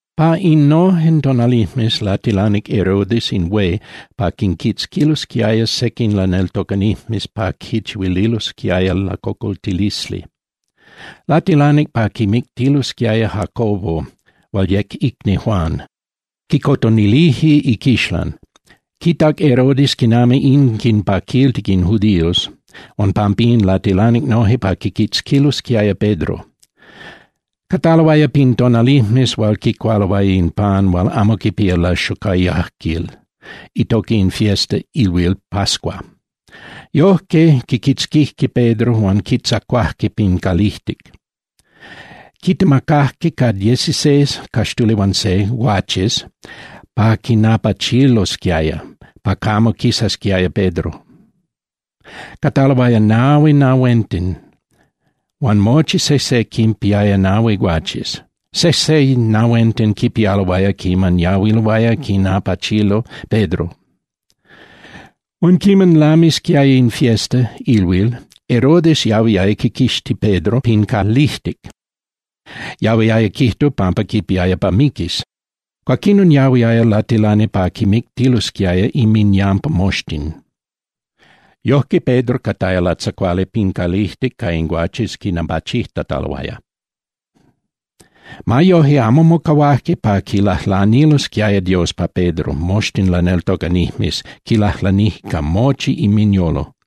Pa innojen tonalijmes latilanic Herodes in hué pa quinquitzquilosquiaya sequin laneltocanijmes pa quinchihuililosquiaya lacocoltilisli. Latilanic pa quimictilosquiaya Jacobo hual yec icni Juan, quicotonilije iquixlan. Quitac Herodes quinami in quinpaquiltic in judíos, huan pampín latilanic noje pa quiquitzquilosquiaya Pedro. Cataloaya pin tonalijmes hual quicualoaya in pan hual amo quipía laxocoyajquil, itoca in fiesta (ilhuil) pascua. Yojque quiquitzquijque Pedro huan quitzacuajque pin calijtic. Quitemacajque ca dieciseis (caxtuli huan se) guaches pa quinapachilosquiaya pa camo quisasquiaya Pedro. Cataloaya nahui nahuenten, huan mochi sejse quinpiaya nahui guaches. Sejse nahuenten quipialoaya quiman yahuiloaya quinapachilo Pedro. Huan quiman lamisquiaya in fiesta (ilhuil), Herodes yahuiaya quiquixti Pedro pin calijtic, yahuiaya quijtu pampa quipiaya pa miquis. Cuaquinon yahuiaya latilani pa quimictilosquiaya inminyampa moxtin. Yojque, Pedro cataya latzacuali pin calijtic ca in guaches quinapachijtataloaya. Ma yoje, amo mocahuajque pa quilajlanilosquiaya Dios pa Pedro moxtin laneltocanijmes, quilajlanijque ca mochi inminyolo.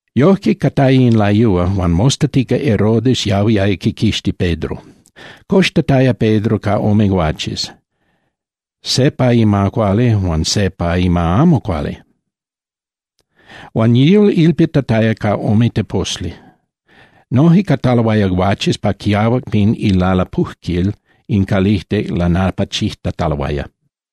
Yojque cataya in layúa, huan mostatica Herodes yahuiaya quiquixti Pedro. Coxtataya Pedro ca ome guaches, se pa ima cuali huan se pa ima amo cuali, huan yihual ilpitataya ca ome teposli. Noje cataloaya guaches pa quiahuac pin ilalapujquil in calijtic lanapachijtataloaya.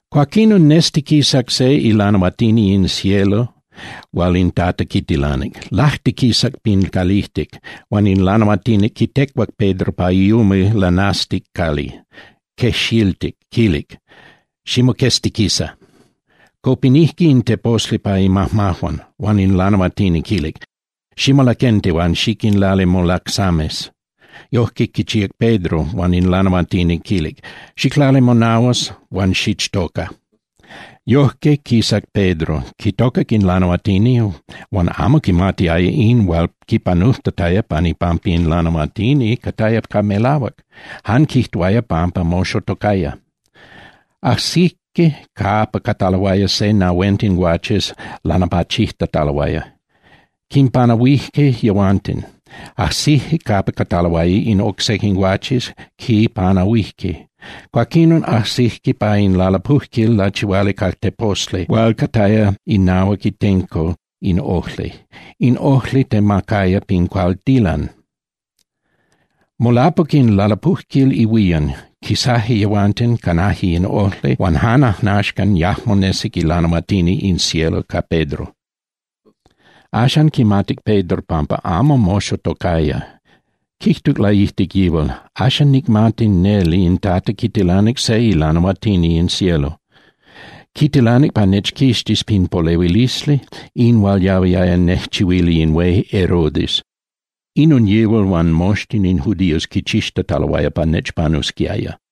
Cuaquinon nestiquisac se ilanahuatini in cielo hual in Tata quitilanic. Lajtiquisac pin calijtic, huan in lanahuatini quitecuac Pedro pa iumil lanasticali, quejxiltic, quilic: —Ximoqueztiquisa. Copinijque in teposli pa imajmajuan. Huan in lanahuatini quilic: —Ximolaquenti huan xiquinlali molacsames. Yojque quichíac Pedro, huan in lanahuatini quilic: —Xiclali monahuas huan xichtoca. Yojque quisac Pedro, quitocac in lanahuatini huan amo quimatiaya in hual quipanujtataya pan ipampa in lanahuatini cataya ca melahuac, jan quijtuaya pampa moxotocaya. Ajsijque capa cataloaya se nahuenten guaches lanapachijtataloaya, quinpanahuije yehuanten, ajsijque capa cataloaya in oc sequin guaches, quinpanahuijque. Cuaquín ajsijque pa in lalapujquil lachihuali ca teposli hual cataya inahuac itenco in ojli, in ojli temacaya pin caltilan. Molapuc in lalapujquil ihuían, quisaje yehuanten, canaje in ojli huan jan ajnaxcan yajmo nesic ilanahuatini in cielo ca Pedro. Axan quimatic Pedro pampa amo moxotocaya, quijtuc laijtic yihual: —Axan nicmati neli in Tata quitilanic se ilanahuatini in cielo. Quitilanic pa nechquixtis pin polehuilisli, in hual yahuiaya nejchihuili in hué Herodes. Inon yihual huan moxtin in judíos quichixtataloaya pa nechpanusquiaya.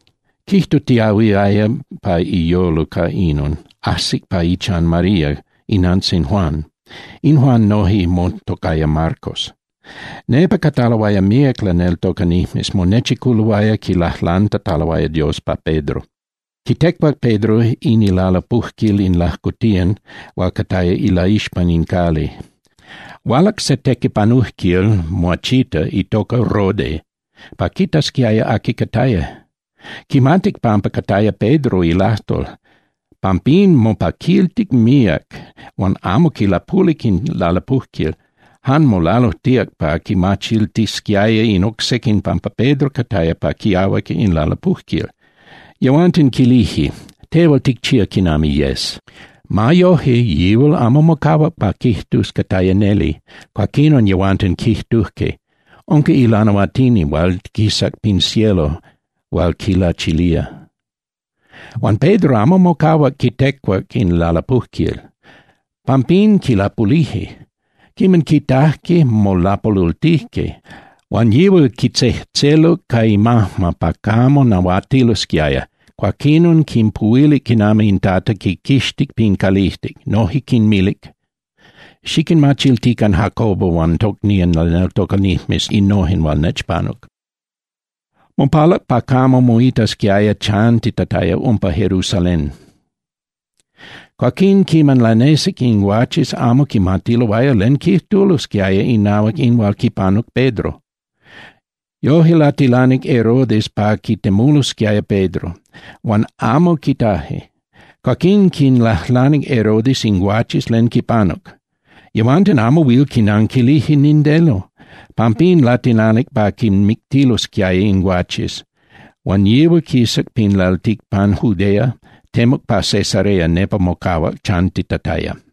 Quijtutiahuiaya pa iyolo ca inon, ajsic pa ichan María inantzin Juan. In Juan noje motocaya Marcos. Nepa cataloaya míac laneltocanijmes, monechiculoaya quilajlantataloaya Dios pa Pedro. Quitecuac Pedro in ilalapujquil in lajcotiyan hual cataya ilaixpan in cali. Hualac se tequipanujquil muachita itoca Rode pa quitasquiaya aqui cataya. Quimatic pampa cataya Pedro ilajtol, pampín mopaquiltic míac huan amo quilapulic in lalapujquil, jan molalujtíac pa quinmachiltisquiaya in oc sequin pampa Pedro cataya pa quiahuac in lalapujquil. Yehuanten quilije: —Tehual ticchía quinami yes. Ma yoje, yihual amo mocahuac pa quijtus cataya neli, cuaquinon yehuanten quijtujque: —Unca ilanahuatini hual quisac pin cielo hual quilachilia. Huan Pedro amo mocahuac quitecuac in lalapujquil, pampín quilapulije. Quiman quitajque, molapolultijque. Huan yihual quitzejtzeluc ca imajma pa camo nahuatilosquiaya, cuaquinon quinpuhuilic quinami in Tata quiquixtic pin calijtic, noje quinmilic: —Xiquinmachiltican Jacobo huan tocnían laneltocanijmes innojen hual nechpanuc. Cuaquín quisac, mopalac pa camo moitasquiaya chantitataya umpa Jerusalén. Cuaquín quiman lanesic, in guaches amo quimatiloaya len quijtulosquiaya inahuac in hual quipanuc Pedro. Yoje latilanic Herodes pa quitemulosquiaya Pedro, huan amo quitaje. Cuaquín quinlajlanic Herodes in guaches len quipanuc. Yehuanten amo huil quinanquilije nindeno. Pampín latilanic pa quinmictilosquiaya in guaches, huan yihual quisac pin lalticpan Judea, temuc pa Cesarea, nepa mocahuac chantitataya.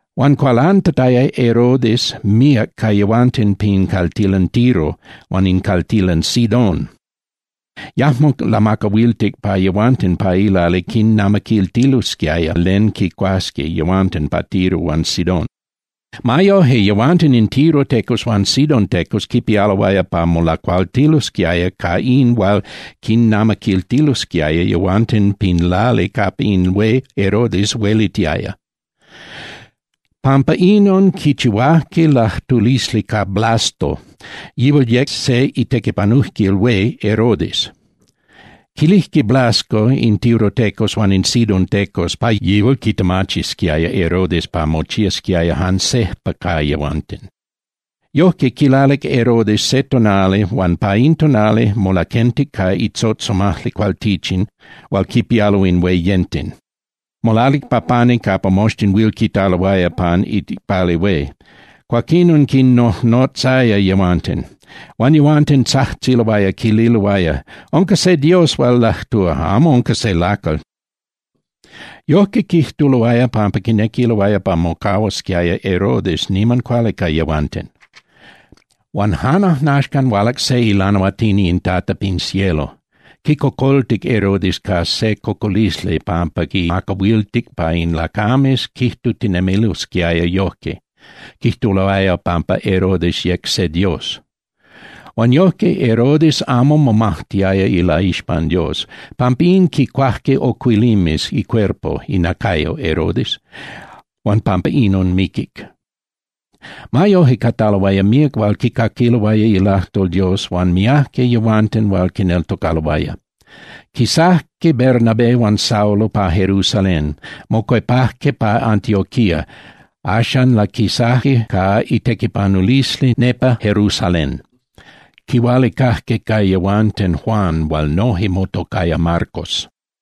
Huan cualantataya Herodes míac ca yehuanten pin caltilan Tiro huan in caltilan Sidón, yajmo lamacahuiltic pa yehuanten pa ilali quinnamaquiltilosquiaya len quicuasqui yehuanten pa Tiro huan Sidón. Ma yoje, yehuanten in tirotecos huan sidontecos quipialoaya pa molacualtilosquiaya ca in hual quinnamaquiltilosquiaya yehuanten pin lali capa in hué Herodes huelitiaya. Pampa inon quichihuajque lajtulisli ca Blasto, yihual yec se itequipanujquil hué Herodes. Quilijque Blasto in tirotecos huan in sidontecos pa yihual quitemachisquiaya Herodes pa mochiasquiaya jan sejpa ca yehuanten. Yojque, quilalic Herodes se tonali huan pa in tonali molaquentic ca itzotzomajli cualtichin hual quipialo in hueyenten. Molalic pa pani capa moxtin huil quitaloaya pan iicpali hué, cuaquinon quinnojnotzaya yehuanten. Huan yehuanten tzajtziloaya, quililoaya: —¡Unca se dios hual lajtúa, amo unca se lacal! Yojque quijtuloaya pampa quinequiloaya pa mocahuasquiaya Herodes niman cuali ca yehuanten. Huan jan ajnaxcan, hualac se ilanahuatini in Tata pin cielo, quicocoltic Herodes ca se cocolisli pampa quimacahuiltic pa in lacames quijtutinemilosquiaya yojque, quijtuloaya pampa Herodes yec se dios. Huan yojque Herodes amo momajtiaya ilaixpan Dios. Pampín, quicuajque ocuilimes icuerpo (inacayo) Herodes, huan pampa inon miquic. Ma yoje, cataloaya míac hual quicaquiloaya ilajtol Dios huan miajque yehuanten hual quineltocaloaya. Quisajque Bernabé huan Saulo pa Jerusalén, mocuepajque pa Antioquía, axan laquisajque ca itequipanulisli nepa Jerusalén. Quihualicajque ca yehuanten Juan hual noje motocaya Marcos.